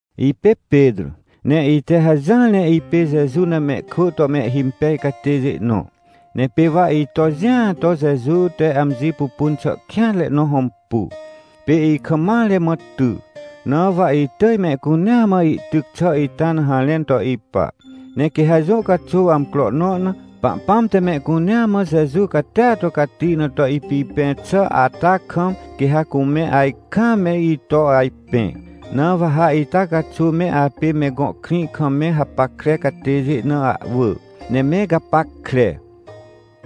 Ipê Petrô, ne ite hajỹar ne ipê Jeju na mehkwỳ to mehhimpej catêjê nõ. Ne pê wa ito jĩa to Jeju te amji pupun xà kêanre na hõmpu, pê ikam mare mã ty. Na wa itỳj mehcunea mã ihtyc xà ita na harẽn to ipa. Ne quê ha jũ caxuw amcro nõ na, Pahpãm te mehcunea mã Jeju catia to cati na to ipipẽ xà ata kam, quê ha cume ajkaam me ito ajpẽ. Na wa ha ita caxuw me apê me gõ krĩ kam me hapackre catêjê na ahwỳ, ne me gapackre.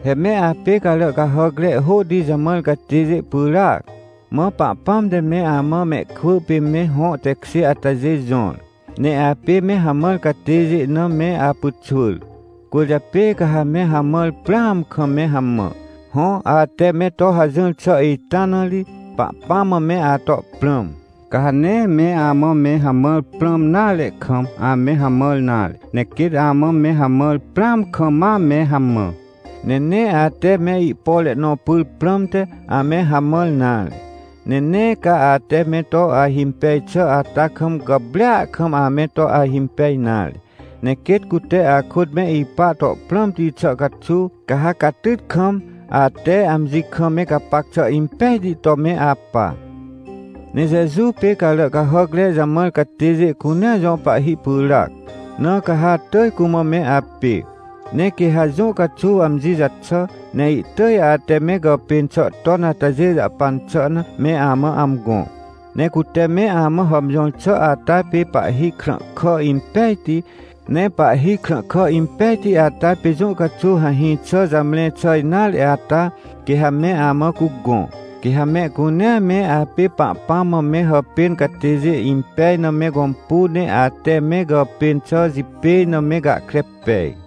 He me apê carà cahàcre hôhti jamãr catêjê pyràac. Mã Pahpãm te me amã mehkwỳ pê me hõ tekjê atajê jõr, ne apê me hamãr catêjê na me apyxwỳr, cwỳrjapê ca ha me hamãr prãam kam me hamã. Hõ, ate me to hajỹr xà ita na ri, Pahpãm mã me ato prãm. Ca ha nee me amã me hamãr prãm nare kam, ame hamãr nare, ne quêt amã me hamãr prãam kam me hamã. Ne nee ate me ihpore nõ pyr prãmte, ame hamãr nare. Ne nee ca ate me to ahimpej xà ata kam gàprêa kam ame to ahimpej nare. Ne quêt cute akôt me ipa to prãmti xà caxuw, ca ha catyt kam, ate amji kam me gapac xà impejti to me apa. Ne Jeju pê carà cahàcre jamãr catêjê cunea jõ pahhi pyràac, na ca ha atỳj cumã me apê. Ne quê ha jũ caxuw amji jaxà, ne ihtỳj ate me gàpên xà ton atajê jahpan xà na, me amã amgõ. Ne cute me amã hàmjõr xà ata pê pahhi krãhkà impejti. Ne pahhi krãhkà impejti ata pê jũ caxuw hahĩ xà jamre xà nare ata, quê ha me amã cugõ. Quê ha mehcunea me apê Pahpãm mã me hàpên catêjê impej na me gõmpu ne ate me gàpên xà jipêj na me gahkre pej.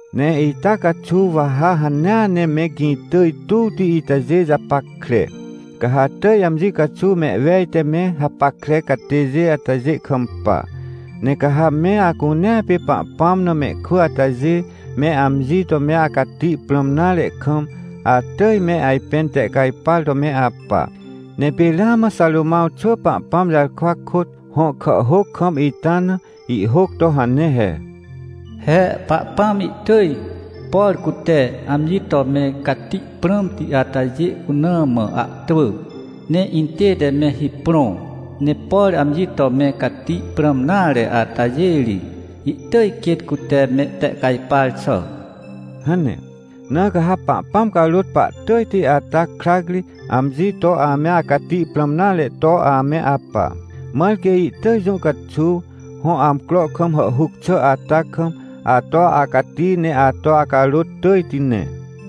Ne ita caxuw wa ha hanea ne me gĩ tỳj tuwti itajê japackre. Ca ha atỳj amji caxuw mehwej te me hapackre catêjê atajê kampa. Ne ca ha me acunea pê Pahpãm na mehkwỳ atajê, me amji to me acati prãm nare kam, atỳj me ajpẽn tehcajpar to me apa. Ne pê ramã Xarômãw xwỳ Pahpãm jarkwa kôt, hõ kàhhôc kam ita na, ihhôc to hane he: “He Pahpãm ihtỳj, por cute amji to me cati prãmti atajê cuna mã ahtwỳ, ne intête me hiprõ. Ne por amji to me cati prãm nare atajê ri, ihtỳj quêt cute mehtehcajpar xà” hane. Na ca ha Pahpãm carôt pahtỳjti ata krac ri, amji to ame acati prãm nare to ame apa. Mãr quê ihtỳj jũ caxuw, hõ amcro kam hàhhuc xà ata kam, ato acati ne ato acarôt tỳjti ne.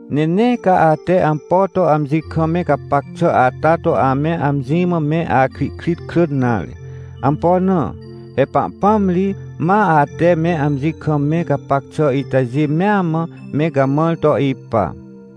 Ne nee ca ate ampo to amji kam me gapac xà ata to ame amji mã me akrihkrit krỳn nare. Ampo na? He Pahpãm ri, ma ate me amji kam me gapac xà itajê mea mã, me gamãr to ipa.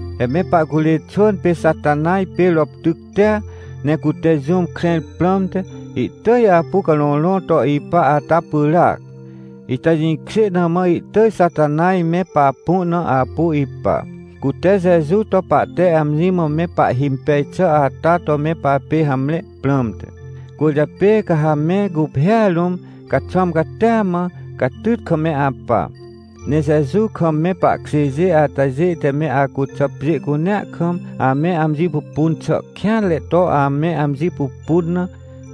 He me pahcurê xwỳn pê Xatanaj pê roptyctia, ne cute jũm krẽr prãmte, ihtỳj apu carõrõ to ipa ata pyràac. Ita jĩkjê na mã ihtỳj Xatanaj me papu na apu ipa, cute Jeju to pahte amji mã me pahhimpej xà ata to me papê hamre prãmte. Cwỳrjapê ca ha me guphêa rũm, caxwãm catia mã, catyt kam me apa. Ne Jeju kam me pahkjêjê atajê te me acuxà pjê cunea kam, ame amji pupun xà kêanre to ame amji pupun na,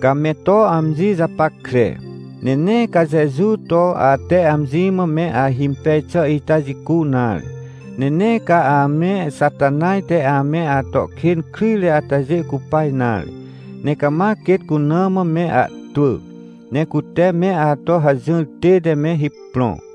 ca me to amji japackre. Ne nee ca Jeju to ate amji mã me ahimpej xà ita jicu nare. Ne nee ca ame Xatanaj te ame ato kên kryjre atajê cupa nare. Ne cama quêt cuna mã me ahtwỳ, ne cute me ato hajỹr tête me hiprõ.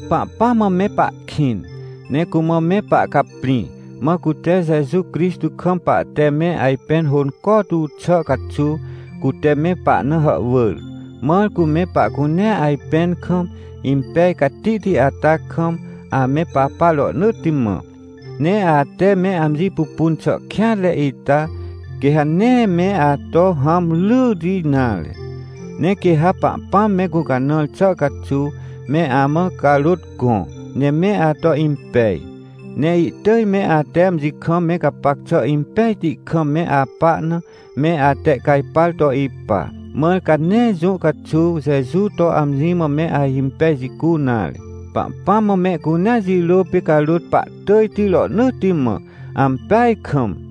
Pahpãm mã me pahkĩn, ne cumã me pahcaprĩ, mã cute Jeju Crixtô kam pahte me ajpẽn hônco tu xà caxuw, cute me pahna hàhwỳr. Mãr cu me pahcunea ajpẽn kam, impej catihti ata kam, ame papa rohnỳtti mã. Ne ate me amji pupun xà kêanre ita, quê ha nee me ato hãm ryyti nare. Ne quê ha Pahpãm me gũcanãr xà caxuw, me amã carôt gõ, ne me ato impej, ne ihtỳj me ate amji kam me gapac xà impejti kam me apa na, me atehcajpar to ipa. Mãr ca nee jũ caxuw Jeju to amji mã me ahimpej jicu nare. Pahpãm mã mehcunea jirôa pê carôt pahtỳjti rohnỳtti mã. Ampeaj kam!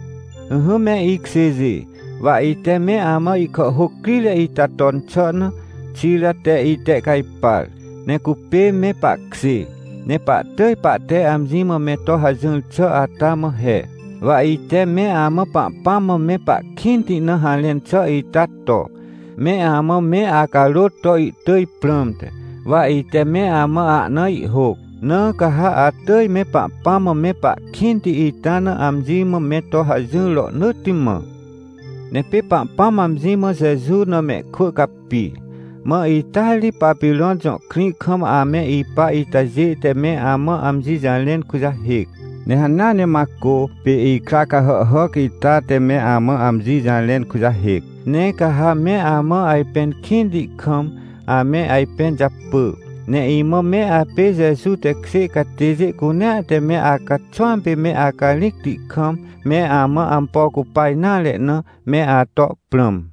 Ỹhỹ me ikjêjê, wa ite me amã ihkàhhôc crire ita ton xà na, Xira te itehcajpar. Ne cupê me pahkjê, ne pahtỳj pahte amji mã me to hajỹr xà ata mã he. Wa ite me amã Pahpãm mã me pahkĩnti na harẽn xà ita to, me amã me acarôt to ihtỳj prãmte, wa ite me amã ahna ihhôc. Na ca ha atỳj me Pahpãm mã me pahkĩnti ita na amji mã me to hajỹr rohnỳtti mã. Ne pê Pahpãm amji mã Jeju na mehkwỳ capi, mã ita ri Papirõn jõ krĩ kam ame ipa itajê te me amã amji jarẽn kujahêc. Ne hanea ne Macô, pê ikra cahàhhàc ita te me amã amji jarẽn kujahêc. Ne ca ha me amã ajpẽn kĩnti kam, ame ajpẽn japỳ. Ne imã me apê Jeju tekjê catêjê cunea te me acaxwãm pê me acarĩcti kam, me amã ampo cupa nare na, me ato prãm.